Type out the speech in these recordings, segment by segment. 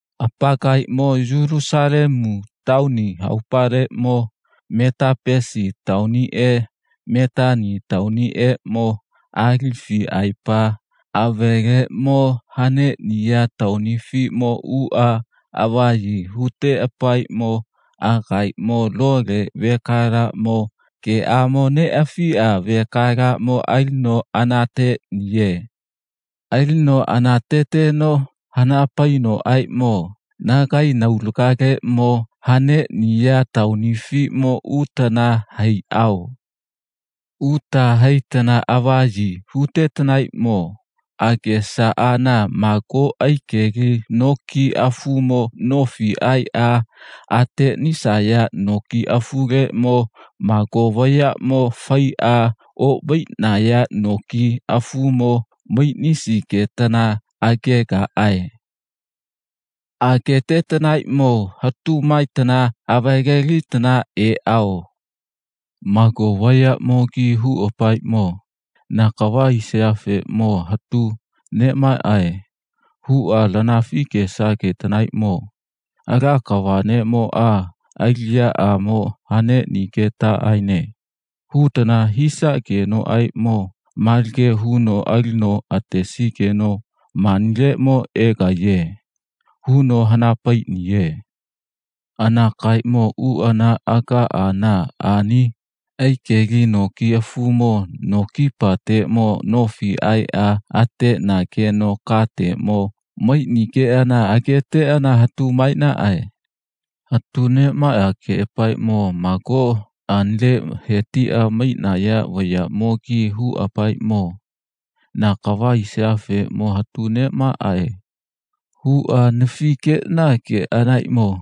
Apakaemo Yulusalemu taoni haopaleʼmo Metapesi taoniʼe Metani taoniʼeʼmo Alifiʼaepa aveleʼmo haneʼniya taonifiʼmo uʼa avaʼyi huteʼapaeʼmo agaemo lole vekalaʼmo geʼamo neʼafiʼa vekalaʼmo alino anateʼniye. Alino anateteno hana painoʼaeʼmo, nagae naulagaleʼmo haneʼniya taonifiʼmo utana haiʼao. Uta haitana avaʼyi hutetanaeʼmo agesaʼana mago aikeli noki afumo nofi aeʼa ateʼnisaya noki afuleʼmo mago vayaʼmo faiʼa oʼmaiʼnaya noki afumo maiʼnisigetana agegaʼae. Agetetanaeʼmo hatu maetana avalelitana eʼao. Mago vayaʼmogi huʼapaeʼmo, na kava hisaʼafeʼmo hatu neʼmaʼae, huʼa lanafi gesagetanaeʼmo, Ala kava neʼmoʼa aliʼyaʼamo haneʼnigetaʼaene, hutana hisaʼagenoʼaeʼmo malage huno alino atesigeno manileʼmo egaiye, huno hana paiʼniye. Anakaemo uʼana agaʼana ani aikeli noki afumo no kipateʼmo nofi aeʼa ateʼnageno kateʼmo maiʼnigeʼana ageteʼana hatu maeʼnaʼae. Hatu neʼmaʼageʼapaeʼmo mago anile he tiʼa maiʼnaya vayaʼmogi huʼapaeʼmo, na kava hisaʼafeʼmo hatu neʼmaʼae, huʼa anafi geʼnaʼageʼanaeʼmo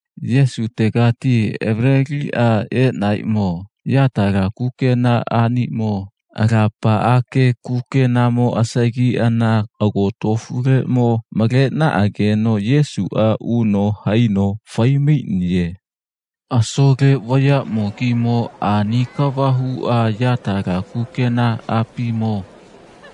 Yesutega avaleliʼeʼanaeʼmo yatala kukenaʼanimo alapaʼage kukenamo asagiʼana agotofuleʼmo maleʼnaʼageno Yesuʼa uno haino fai maiʼniye. Asole vayaʼmogimo ani kava huʼa yatala kukenaʼapimo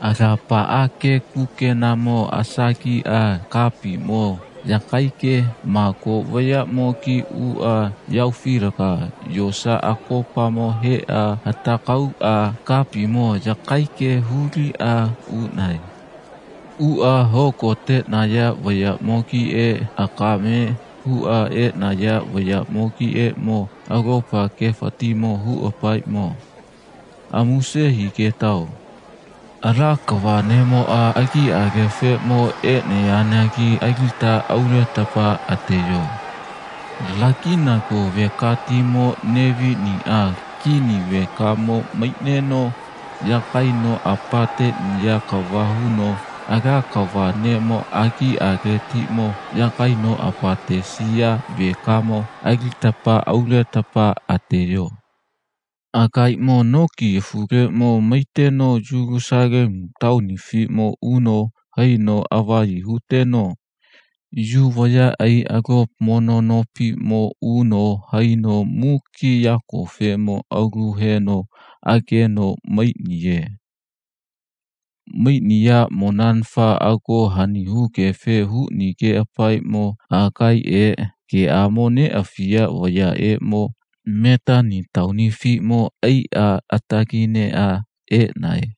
alapaʼage kukenamo asagiʼa kapiʼmo yakaige mago vayaʼamogi uʼa yahaofilaga yosa akopamo heʼa hatagauʼa kapiʼmo yakaige huliʼa uʼnae. Uʼa hogoteʼnaya vayaʼmogiʼe akame huʼa eʼnaya vayaʼmogiʼeʼmo alopa gefatiʼmo huʼapaeʼmo, amuse higetao. Ala kava neʼmo agiʼalefeʼmo neʼeyanagi alita auletapa ateyo. Laginago vekatimo Neviniʼa kini vekamo maiʼneno yagaino apateʼniya kava huno Ala kava neʼmo agiʼaletiʼmo yagaino apatesiya vekamo alita auletapa ateyo. Agaemo noki afuleʼmo maiteno Yulusalemu taonifiʼmo uno haino avaʼyi huteno Yu vayaʼai alopa mono nopiʼmo uno haino muki yakofeʼmo aulu heno ageno maiʼniye. Maiʼniyaʼmonanafa ago hani hugefe huʼnigeʼapaeʼmo agaeʼe geʼamo neʼafiya vayaʼeʼmo Metani taonifiʼmo aiʼa atagineʼa eʼnae.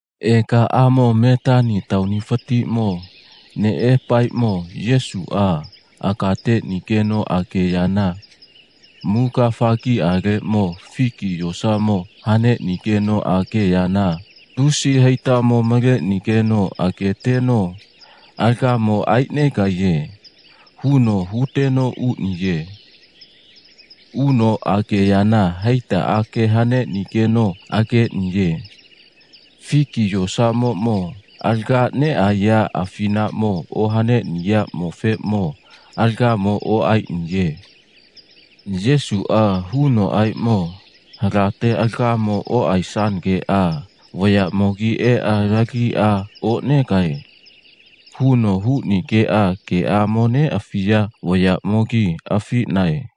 Egaʼamo Metani taonifatiʼmo neʼeʼapaeʼmo Yesuʼa aga teʼnigeno ageyana muga afagiʼaleʼmo figi yosamo haneʼnigeno ageyana lusi haitamo maleʼnigeno ageteno alagamo aeʼnegaiye, huno huteno uʼniye. Uno ageyana haitaʼage haneʼnigeno ageʼniye. Figi yosamoʼmo alaga neʼaeya afinaʼmo ohaneʼniyaʼmofeʼmo alagamo oʼaeʼniye. Yesuʼa hunoʼaeʼmo, halate alagamo oʼaesanageʼa vayaʼmogi eʼa lagiʼa oʼnegae, huno huʼnigeʼa geʼamo neʼafiya vayaʼmogi afiʼnae.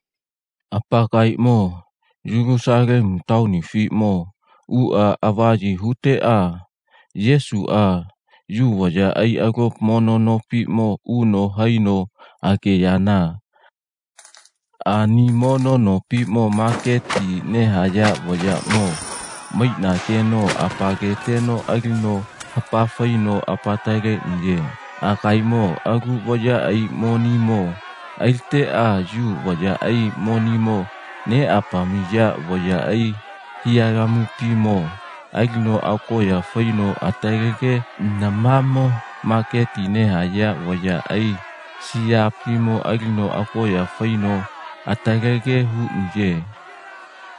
Apakaemo Yulusalemu taonifiʼmo uʼa avaʼyi huteʼa Yesuʼa Yu vayaʼai alopa mono nopiʼmo uno haino ageyana ani mono nopiʼmo maketi nehaya vayaʼmo maiʼnageno apaketeno alino hapa faino apataleʼniye. Agaemo alu vayaʼai monimo aliteʼa Yu vayaʼai monimo neʼapamiya vayaʼai hiʼyalamuʼapimo alino agoʼya faino atalege namamo maketi nehaya vayaʼai siyaʼapimo alino agoʼya faino atalege huʼniye.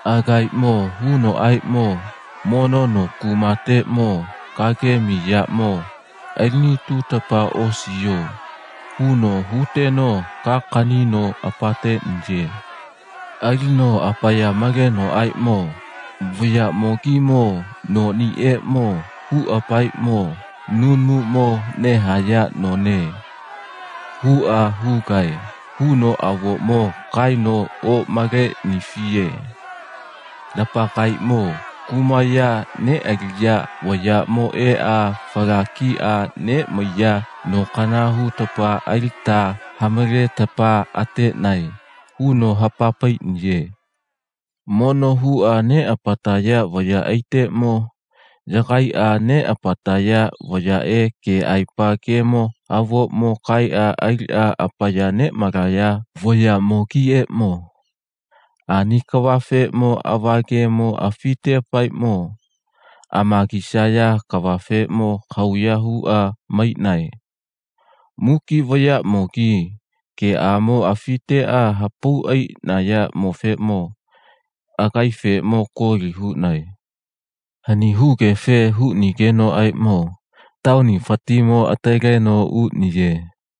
Agaemo hunoʼaeʼmo, mono no kuma kateʼmo kagemi yaʼmo aliʼnituteta osiyo, huno huteno ka akanino apateʼniye. Alino apaya malenoʼaeʼmo, vayaʼmogimo noʼnieʼmo huʼapaeʼmo, nunumuʼmo nehaya none, huʼa hugae, huno avoʼmo kaeno oʼmaleʼnifiye. Lapakaemo kumaya neʼaliya vayaʼmo eʼa fala kiʼa neʼmaiya nokana hutapa alita ha maletapa ateʼnae, huno hapa paiʼniye. Mono huʼa neʼapataya vayaʼaiteʼmo yagaiʼa neʼapataya vayaʼe keʼaepa gemo avoʼmo kaeʼa aliʼa apaya neʼmalaya vayaʼmogiʼeʼmo ani kavafeʼmo ava gemo afiteʼapaeʼmo amagisaya kafeʼmo kahauya huʼa maiʼnae. Muki vayaʼmogi geʼamo afiteʼa hapau aiʼnayaʼmofeʼmo agaefeʼmo koli huʼnae. Hani hugefe huʼnigenoʼaeʼmo taonifatiʼmo ataleno uʼniye.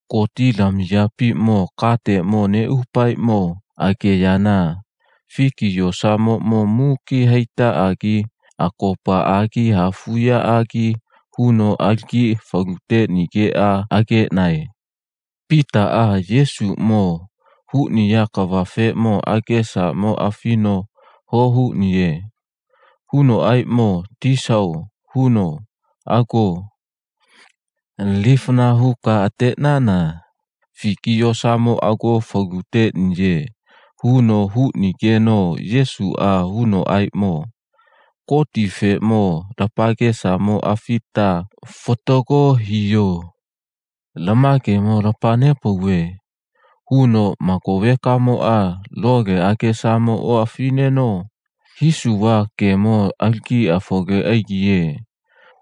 Gotilamiyapiʼmo kateʼmo neʼuʼapaeʼmo ageyana figi yosamoʼmo muki haitaʼagi akopaʼagi hafuʼyaʼagi huno alagi falu teʼnigeʼa ageʼnae. Pitaʼa Yesuʼmo huʼniya kavafeʼmo agesamo afino ho huʼniye. Hunoʼaeʼmo, Tisao, huno, ago. Lifana huka ateʼnana figi yosamo ago falu teʼniye, huno huʼnigeno Yesuʼa hunoʼaeʼmo, Gotifeʼmo lapakesamo afita fatago hiyo. Lama gemo lapa nepauve, huno, mago vekamoʼa lole agesamo oʼafiʼneno, hisuva gemo alagi afole aigiye,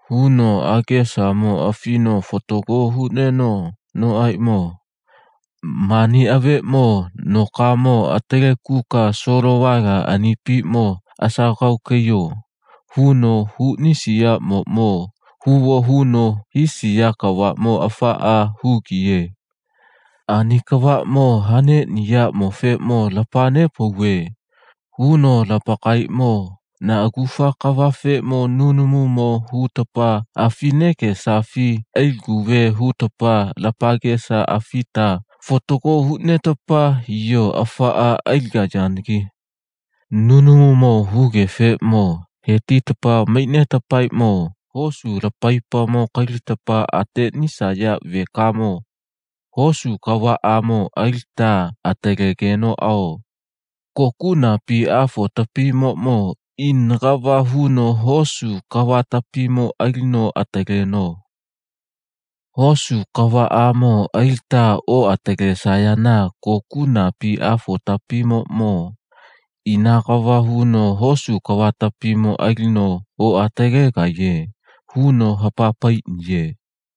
huno agesamo afino fatago huʼnenoʼaeʼmo mani aveeʼmo, nokamo atalekuka solovala anipiʼmo asagauka aiyo, huno huʼnisiyaʼmoʼmo huvo huno hisiya kavaʼmo afaʼa hugiye. Ani kavaʼmo haneʼniyaʼmofeʼmo lapa nepauve, huno, lapakaemo na agufa kavafeʼmo nunumuʼmo hutapa afi negesafi aliguve hutapa lapakesa afita fatago huʼnetapa hiyo afaʼa aligayanagi. Nunumuʼmo hugefeʼmo he tita maiʼnetapaeʼmo hosu lapaipamo kalitapa ateʼnisaya vekamo hosu kavaʼamo alita atalegenoʼao kokuʼnapi Afotapimoʼmo ina kava huno hosu kavatapimo alino ataleno. Hosu kavaʼamo alita oʼatalesayana kokuʼnapi Afotapimoʼmo ina kava huno hosu kavatapimo alino oʼatalegaiye, huno hapa paiʼniye.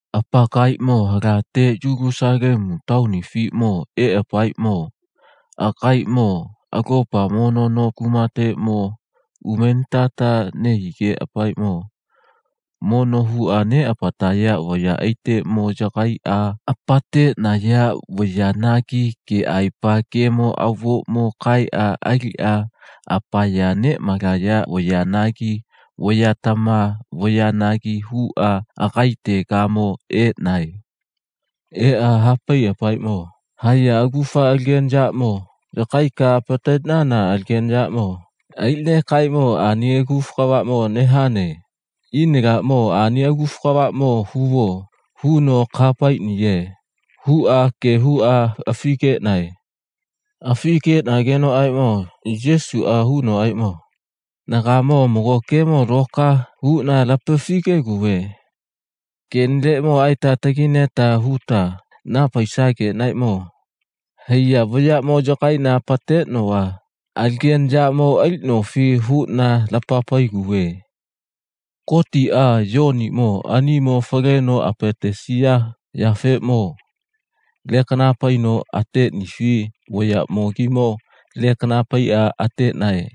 Apakaemo halate Yulusalemu taonifiʼmo eʼapaeʼmo agaemo alopa mono no kumateʼmo umenitata nehigeʼapaeʼmo mono huʼa neʼapataya vayaʼaiteʼmo yagaiʼa apateʼnaya vayanagi keʼaepa gemo avoʼmo kaeʼa aliʼa apaya neʼmalaya vayanagi vayatama vayanagi huʼa agaetegamo eʼnae. Eʼa ha paiʼapaeʼmo, haiya agufa alagena yaʼmo yagaika apateʼnana alagena yaʼmo aliʼnekaeʼmo ani agufa kavaʼmo nehane. Ina laʼmo ani agufa kavaʼmo huvo, huno kaha paiʼniye, huʼa ge huʼa afi geʼnae. Afi geʼnagenoʼaeʼmo Yesuʼa hunoʼaeʼmo, nagaeʼeʼmo mago gemo loka huʼna lapafi gegauve. Keʼnileʼmo aeta atagaina huta naha paisageʼnaeʼmo haiya yaʼmo yagaiʼna apateʼnova alagena yaʼmo aliʼnofi, huʼna lapa paiguve. Gotiʼa Yoniʼmo aniʼmo faleno apatesiyafeʼmo lekana paino ateʼnifi vayaʼmogimo lekana paiʼa ateʼnae,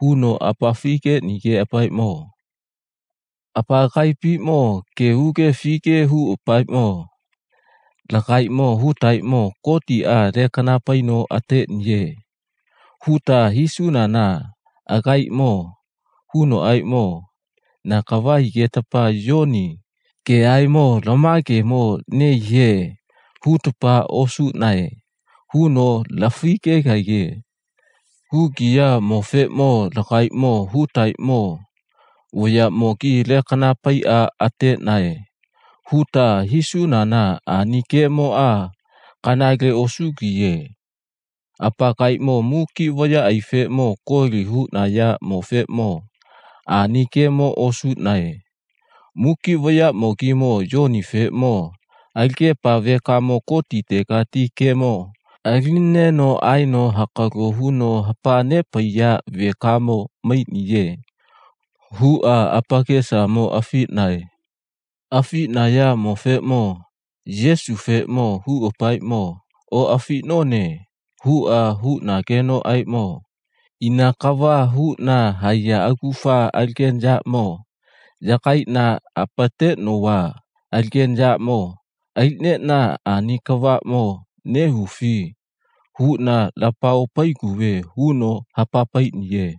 huno apafi geʼnigeʼapaeʼmo apakaiʼapimo ge huge afige huʼapaeʼmo, Lagaemo hutaeʼmo Gotiʼa lekana paino ateʼniye, huta hisunana agaemo hunoʼaeʼmo, na kava higetapa Yoni geʼaeʼmo lama gemo nehiye, hutapa osuʼnae, huno lafi gegaiye. Hugiyaʼmofeʼmo lagaemo hutaeʼmo, vayaʼmogi lekana paiʼa ateʼnae, huta hisunana ani gemoʼa kanale osugiye. Apakaemo muki vayaʼaifeʼmo koli huʼnayaʼmofeʼmo ani gemo osuʼnae. Muki vayaʼmogimo Yonifeʼmo alagepa vekamo Gotitegati gemo alinineno aeno hakalo huno hapa nepaiya vekamo maiʼniye, huʼa apakesamo afiʼnae. Afiʼnayaʼmofeʼmo Yesufeʼmo huʼapaeʼmo, oʼafiʼnone, huʼa huʼnagenoʼaeʼmo, ina kava huʼna haiya agufa alagena yaʼmo yagaiʼna apateʼnova alagena yaʼmo aliʼneʼna ani kavaʼmo nehufi, huʼna lapa opaiguve, huno hapa paiʼniye.